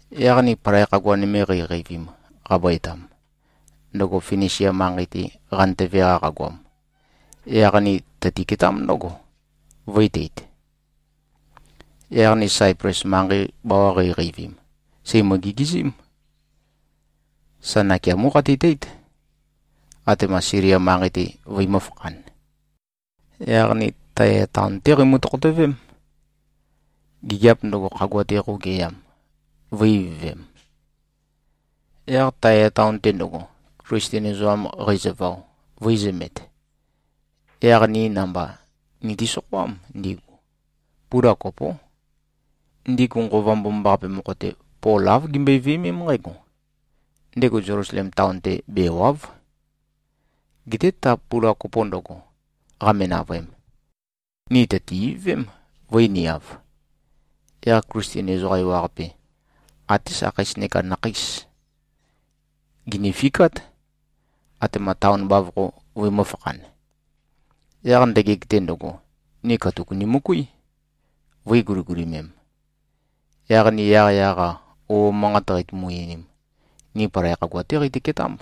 Yaq ni palai khagua nøme qeiqeivim, qabøetam, ndøgo Finisia manqei-te qantøve-qa qagoam, yaq ni teitø-ketámb ndǿgo, vø̄i-teit. Yaq ni Saiples manqei bawa qeiqeivim, sèimø-gigizím. Sa nakeamó qeitøteít, atema Silia manqei-te vøimø̄-fakhan. Yaq ni Taya taon-té qeimø-tokhotøvém, gigiap ndøgo, khagua-te qøugeyam, vø̄-ivøvem. Yaq Taya taon-te ndøgo, Klisten ezoqam qeizøvao, vø̄izømet, yaq ni namba niti-sokhoám ndigu. Pula kopó. Ndigu Nqova Mbomambaqape mokho-te, Pol āv gimbøe-viømém nqǽgo: Ndego Zelusalem taon-te bèwa᷄v. Geté ta pula kopo ndøgo, qame-navøem, ni tø̀ti-ivøvém, vø̄i-niav. Yaq Klisten ezoqa ewaqape, até sakheis neka nakheis, gìnifikát, atema taon bavokho vøimø̄-fakhan. Yaq ndøgeg-te ndøgo, ni katuk nimøkuí, vø̄i-guligulimem. Yaq ni yaqyaq-a, ouo manqat qeitumu-einim, ni palai khagua-té qeitø-ketámb,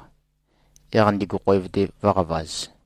yaq ndigu khoev-te vø̄qavaz.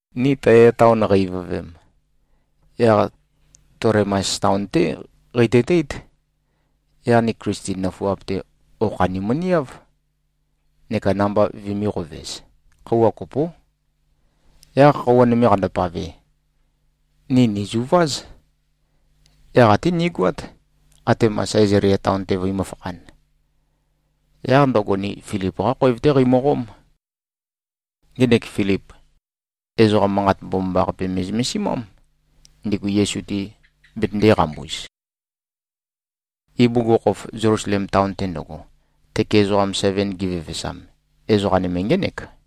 Ni Taya taon qei-ivøvem, yaq Tolemais taon-té qeitøteít. Yaq ni Klisten nøfuap-te, okha nimøniáv, neka namba vømī-qovez. Khøuwa kopó. Yaq khøuwa nøme qandopave, ni nìzuváz. Yaq até nigoát, atema Sæzalia taon-te vøimø̄-fakhan. Yaq ndøgo, ni Filip-qá khoev-té qeimøqóm. Ngenek Filip, ezoqa Manqat Mbomambaqape me꞉zømesimám, ndigu Yesu-te betøndēqambuz. Ibugukhokhof, Zelusalem taon-te ndøgo, tøke ezoqam seven givevesam, ezoqa nøme ngének.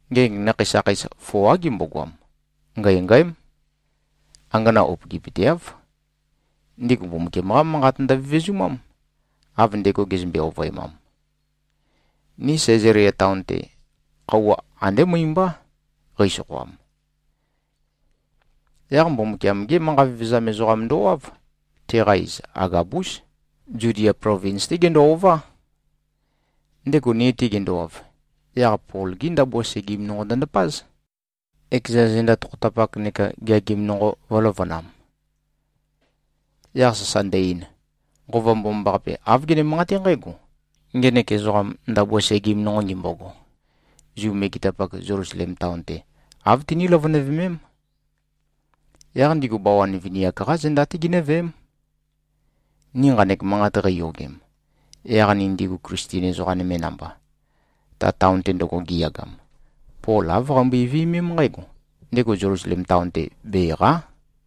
Ngenek nakhei sakheis foá gimbogoam. Ngængǽm. Angana upøgipøteáv. Ndigu Mbumbukiam-qá Manqat ndøvevezumám, av ndego gezømbe-ovøemam. Ni Sæzalia taon-te, khøuwa andé møi-mbá qeisokhoam. Yaq Mbumbukiam-gé manqa vevezam ezoqam ndowáv. Teqa iz Agabús. Zudia plovins-té gendo-ová. Ndego ni-te gendowav, yaq Pol-gi ndabua segim nonqo ndøndapáz, ekeza zenda tokhotapak neka geagim nonqo vø̄løvønam. Yaq sasa ndø-ein, “Nqova Mbomambaqape, āv gene-manqaté nqǽgo: Ngenek ezoqam, ndabua segim nonqo ngimbogo, Zu megetapak Zelusalem taon-te, āv tiní-løvønøvemém. Yaq ndigu bawan vini-ak-qá zenda-té ginǿveém.” Ni nqanek manqat qeiyogem, yaq ni ndigu Klisten ezoqa nøme namba, ta taon-te ndøgo giyagam, Pol āv qeimbøe-viømém nqǽgo: Ndego Zelusalem taon-te bèqa᷄.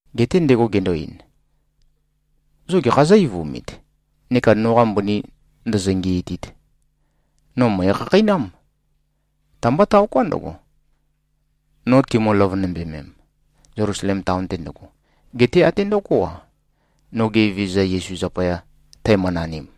Geté ndego gendo-ein, “Zo gekha zó-eivumit neka noqa mbøni ndōzō-ngīītīt? No mø̀ekhakheinám. Ta-mbá taoká ndøgo, no timø-løvønømbemem, Zelusalem taon-te ndøgo. Geté até ndøgó-a, noge Evezøza Yesu zapaya tæmønanim.”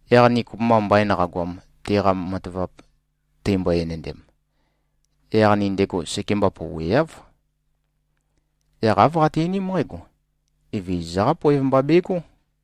Yaq ni kopømba mbain qagoam, teqa matavap teimbo-enendem, yaq ni ndego sekemba pouweáv. Yaq āv qati-einím nqǽgo, “Evezøza-qá poev mba begó.”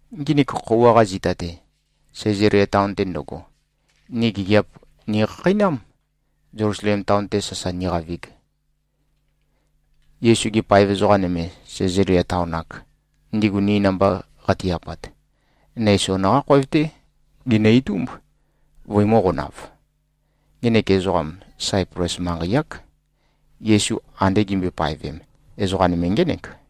Nginik khøuwa-qa zita-te, Sæzalia taon-te ndøgo, ni gigiap nikhakheinám, Zelusalem taon-te sasa niqavig. Yesu-gi paev ezoqa nøme, Sæzalia taon-ak, ndigu ni namba qati-apat, Neison-qá khoev-té ginø-itúmb, vøimø̄qonav. Ngenek ezoqam, Saiples manqei-ák. Yesu ande gimbøe-paevem, ezoqa nøme ngének.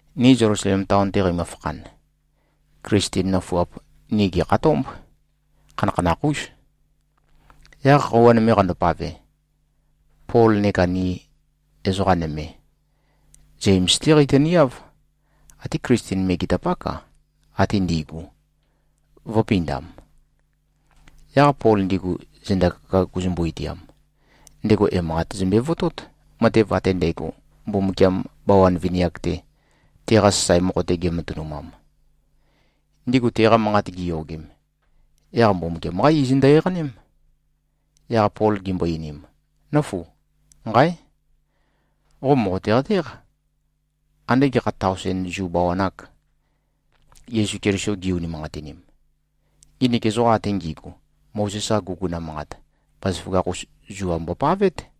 Ni Zelusalem taon-te qeimø-fakhan, Klisten nøfuap, ni gèkhatómb. Khanakhanakh-ús. Yaq khøuwa nøme qandopave, Pol neka ni ezoqa nøme, Zems-té qeitøniáv. Até Klisten megetapák-a, ate ndi꞉gu, vø̄pindam. Yaq Pol ndigu zenda kaka guzumbu-itiam, ndego emanqat zømbe-votót, matev ate ndægo, Mbumbukiam bawan vini-ak-te, teqa sasae mokho-te gematønumam. Ndigu teqa manqat giyogem, yaq Mbumbukiam-qá iz ndø-eqaném. Yaq Pol gimbo-einim, “Nǿfu. Nqáe! Qo mòqote-qatéq, ande gekha taosen Zu bawan-ak, Yesu Keliso gi-unimanqatinim. Nginik ezoqa ate ngi꞉gu, Mozes-qa guguna manqat, bazaføgakh-us zua mbopavét.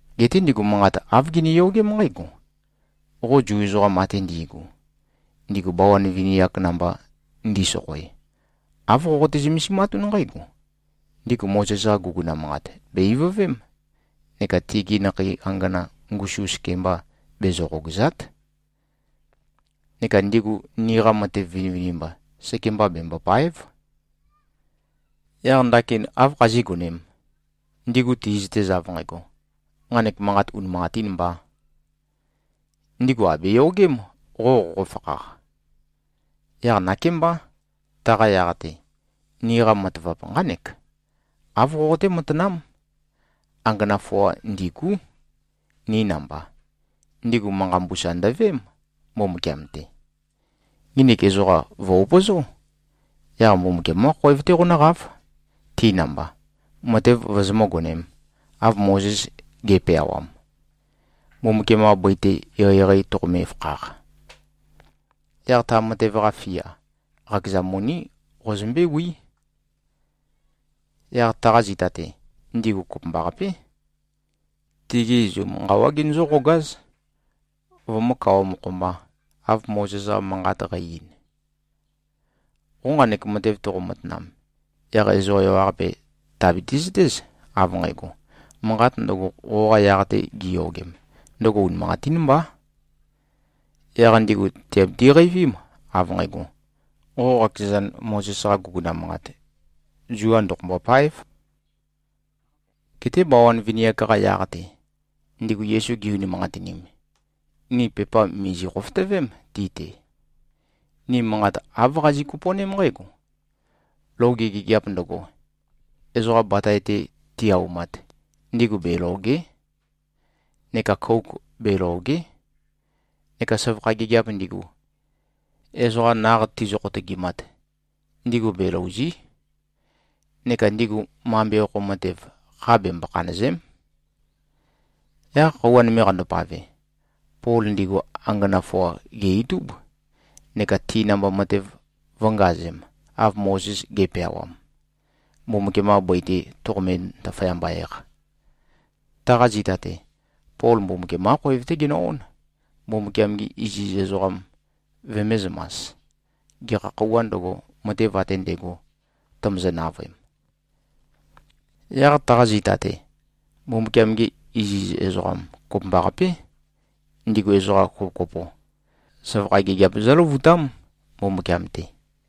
Geté ndigu manqat āv giniyogém nqǽgo: Qo Zu ezoqa ate ndi꞉gu, ndigu bawan vini-ak namba ndi꞉sokhoe, āv qoqote-zømesimatún nqǽgo: Ndigu Mozes-qa guguna manqat bè-ivøvém neka tigi nakhei angana ngusum sekembā bezø-qogàza᷄t, neka ndigu niqa matev vinivinimba sekembā bembòpa᷄ev. Yaq ndakin áv khazígonēm, ndigu ti꞉zøtez av nqægo, nqanek manqat unimanqatīn mbā? Ndigu àbeyogém, qo qoqofakhaq. Yaq nakémbá, taqa yaq-te, niqa matavap nqánek. Āv qoqoté-matanám. Angana foa ndîgú, ni namba. Ndigu manqa mbusa ndøveém, Mbumbukiam-te. Nginik ezoqa, vø̀-upøzó. Yaq Mbumbukiam-qá khoev-té qonǿqáv, ti namba, matev vozomǿ-gonēm, av Mozes ge꞉peawam, Mbumbukiam-qa bøi-te eqeieqei toqome-fakhaq. Yaq ta matev-qa fia, qakeza moní qozømbéwí. Yaq taqa zita-te, ndigu kopømbaqapé, tigi izum nqawá genøzǿ-qogáz, vømǿ-kawa-mokho-mbā, av Mozes-qa manqat qæ-ein. Qo nqanek matev toqo-matanam, yaq ezoqa ewaqape tìabiti-zøtéz, av nqægo, manqat ndøgo, qoqa yaq-te gi꞉yogem, ndøgo unimanqatín mbá. Yaq ndigu tìabiti-qeivím, av nqægo, qo qakezan, Mozes-qa guguna manqat zua ndoqombô-páev. Geté bawan vini-ak-qa yaq-te, ndigu Yesu gi-unimanqatinim, ni pepa mìzi-khofotøvém ti-te. Ni manqat āv qazi꞉-kopo꞉ném nqǽgo: Loge gigiap ndøgo, ezoqa batae-te ti-aumat, ndigu belòge᷄. Neka kouk belòge᷄. Neka søvakha gigiap ndigu, ezoqa naq tizø-khotøgimat, ndigu belòuzi᷄. Neka ndigu mambe okho matev, kha bembo-khanø̀ze᷄m.” Yaq khøuwa nøme qandopave, Pol ndigu angana foa gè-itúb, neka ti namba matev vø̄ngazem, av Mozes ge꞉peawam, Mbumbukiam-qa bøi-te toqome-ndaføyamba-eq. Taqa zita-te, Pol Mbumbukiam-qá khoev-té genø-ón, Mbumbukiam-gi iziz ezoqam vømēzømas, gekha khøuwā ndøgo, matev ate ndægo tømøzø-navøem. Yaq taqa zita-te, Mbumbukiam-gi iziz ezoqam kopømbaqapé, ndigu ezoqa kopokopo, søvakha gigiap zǿløvutám Mbumbukiam-te.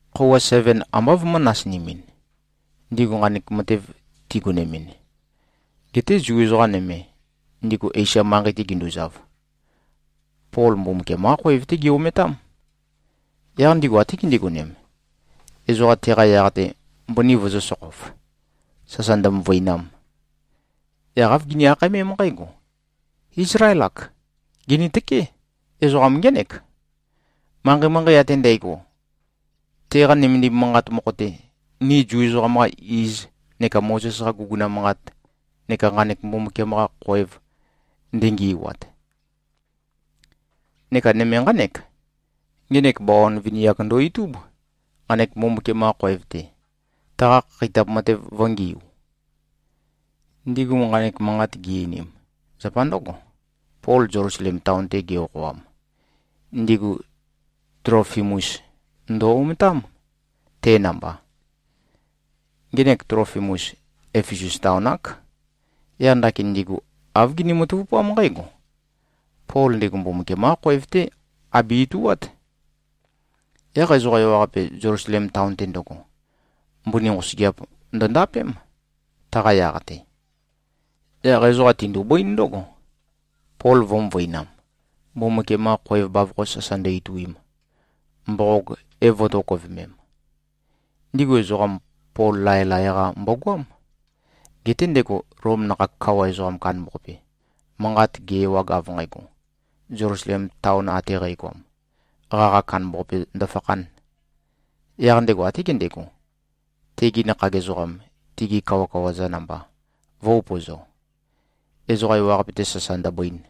Khøuwa seven ambá vømø̄-nasinimin, ndigu nqanek matev tigonemin. Geté Zu ezoqa nøme, ndigu Esia manqei-te ginduzav, Pol Mbumbukiam-qá khoev-té gi-ometám. Yaq ndigu até gindigonem, ezoqa teqa yaq-te mbøni vøzø̄-sokhof, sasa ndømøvøinam. Yaq āv gini-akhaemém nqǽgo, “Ízlael-ak! Gìnitøké! Ezoqam ngének, manqei-manqei ate ndægo, teqa nømendim manqat mokho-te, ni Zu ezoqam-qa iz neka Mozes-qa guguna manqat neka nqanek Mbumbukiam-qa khoev ndengi꞉wat. Neka nøme nqánek: Ngenek bawan vini-ak ndo-itúb, nqanek Mbumbukiam-qa khoev-te, taqa khakheitap matev vø̄ngiu.” Ndigu nqanek manqat gi-einim, zapa ndǿgo. Pol Zelusalem taon-te ge-okhoam, ndigu Tlofimus ndø-ometám, te namba. Ngenek Tlofimus, Efesus taon-ák. Yaq ndakin ndigu āv gini-matavupám nqǽgo: Pol ndego Mbumbukiam-qá khoev-té abe-ituát. Yaq ezoqa ewaqape, Zelusalem taon-te ndøgo, mbøni nqosøgeap ndøndapém, taqa yaq-te. Yaq ezoqa tindubǿin ndǿgo, Pol vø̄-møvøinam, Mbumbukiam-qa khoev bavokho sasa ndø-ituim, mboqog é-vø̄tokøvemem. Ndigu ezoqam, Pol laelae-qa mbogoám. Geté ndego Lom nakhag kawa ezoqa kandambaqape, manqat ge-ewag, av nqægo, Zelusalem taon ate qægoam, qaqa kandambaqape ndøfakhān, yaq ndego até gendego, tegi nakhag ezoqam, tigi kawakawa-za namba vø̄-upøzo, ezoqa ewaqape-te sasa ndøbøin.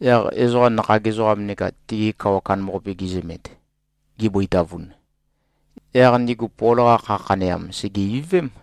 Yaq ezoqa nakhag ezoqam neka tigi kawa kandambaqape gizømet, gibøitavun, yaq ndigu Pol-qa kha khaneam, sège-ivøvém.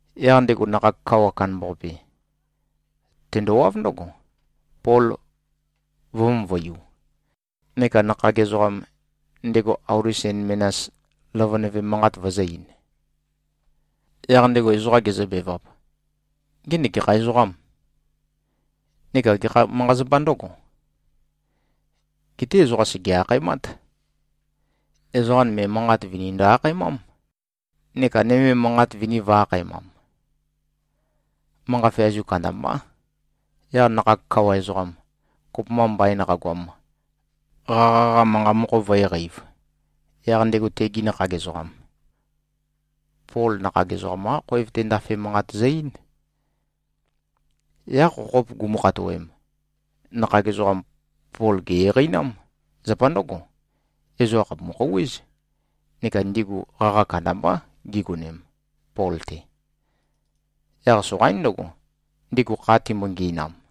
Yaq ndego nakhag kawa kandambaqape, tendowáv ndǿgo, Pol vø̄-møvøiu, neka nakhag ezoqam, ndego auli sen menas løvønøvem manqat vøzø̄-ein. Yaq ndego ezoqa gezøbevap, “Ngenek gekha ezoqâm? Neka gekha manqa-zapa ndǿgo?” Geté ezoqa sège-akhaemát. Ezoqa nøme manqat vini ndø-akhaemám, neka nøme manqat vini vø̄-akhaemam. Manqa feazu kandambá. Yaq nakhag kawa ezoqam, kopømba mbain qagoam, qaqa-qa manqa mokho vǿe-qeīv, yaq ndego tegi nakhag ezoqam, Pol nakhag ezoqam-qa khoev-te ndafe manqat zø-eín. Yaq khokhop gumu-khatoem, nakhag ezoqam, Pol gè-eqeinám. Zapa ndǿgo. Ezoqa khàpumu-khouwéz, neka ndigu qaqa kandambá gigonem, Pol-te. Yaq soqaín ndøgo, ndigu kha timbo-ngi꞉nam.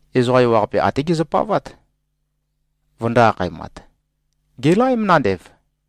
Ezoqa ewaqape até gezøpavát, vøndō-akhaemat, “Gèlaém nandev!”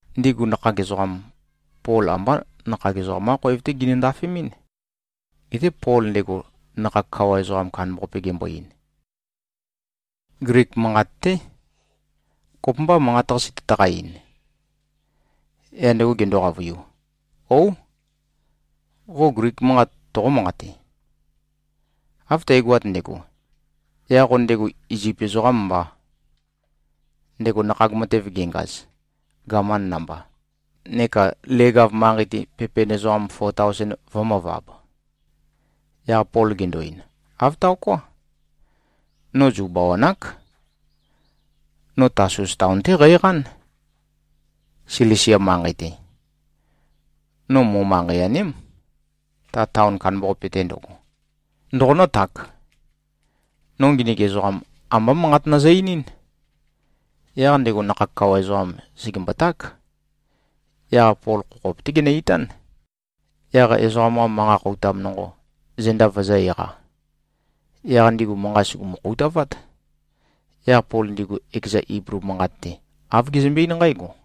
Ndigu nakhag ezoqam, Pol ambá nakhag ezoqam-qá khoev-té ginø-ndafemɨ́n. Geté Pol ndego nakhag kawa ezoqa kandambaqape gembo-ein, Glik manqat-té, “Kopømbâ, manqat-qase tøtaqa-ein?” Yaq ndego gendo-qavøiu, “Óu! Qo Glik manqat toqó-manqate? Av tægoat ndægo, yaq qo ndego Izip ezoqám mbá, ndego nakhag matev gengaz, gaman namba, neka leg-av manqei-te pepen ezoqam fo taosen vø̄møvab.” Yaq Pol gendo-ein, “Āv taoká. No Zu bawan-ák. No Tasus taon-té qæqán, Silisia manqei-te. No mo-manqei-aném, ta taon kandambaqape-te ndøgo. Ndoqonǿtak? No nginik ezoqam, ambá manqat nøzø-einín.” Yaq ndego nakhag kawa ezoqam sègemboták. Yaq Pol khokhop-té genø-itán, yaq ezoqam-qa manqa khoutam nonqo, zenda vøzø̄-eqa. Yaq ndigu manqa sùgumu-khoutavát. Yaq Pol ndigu ekeza Iblu manqat-te, āv gezømbe-eín nqǽgo: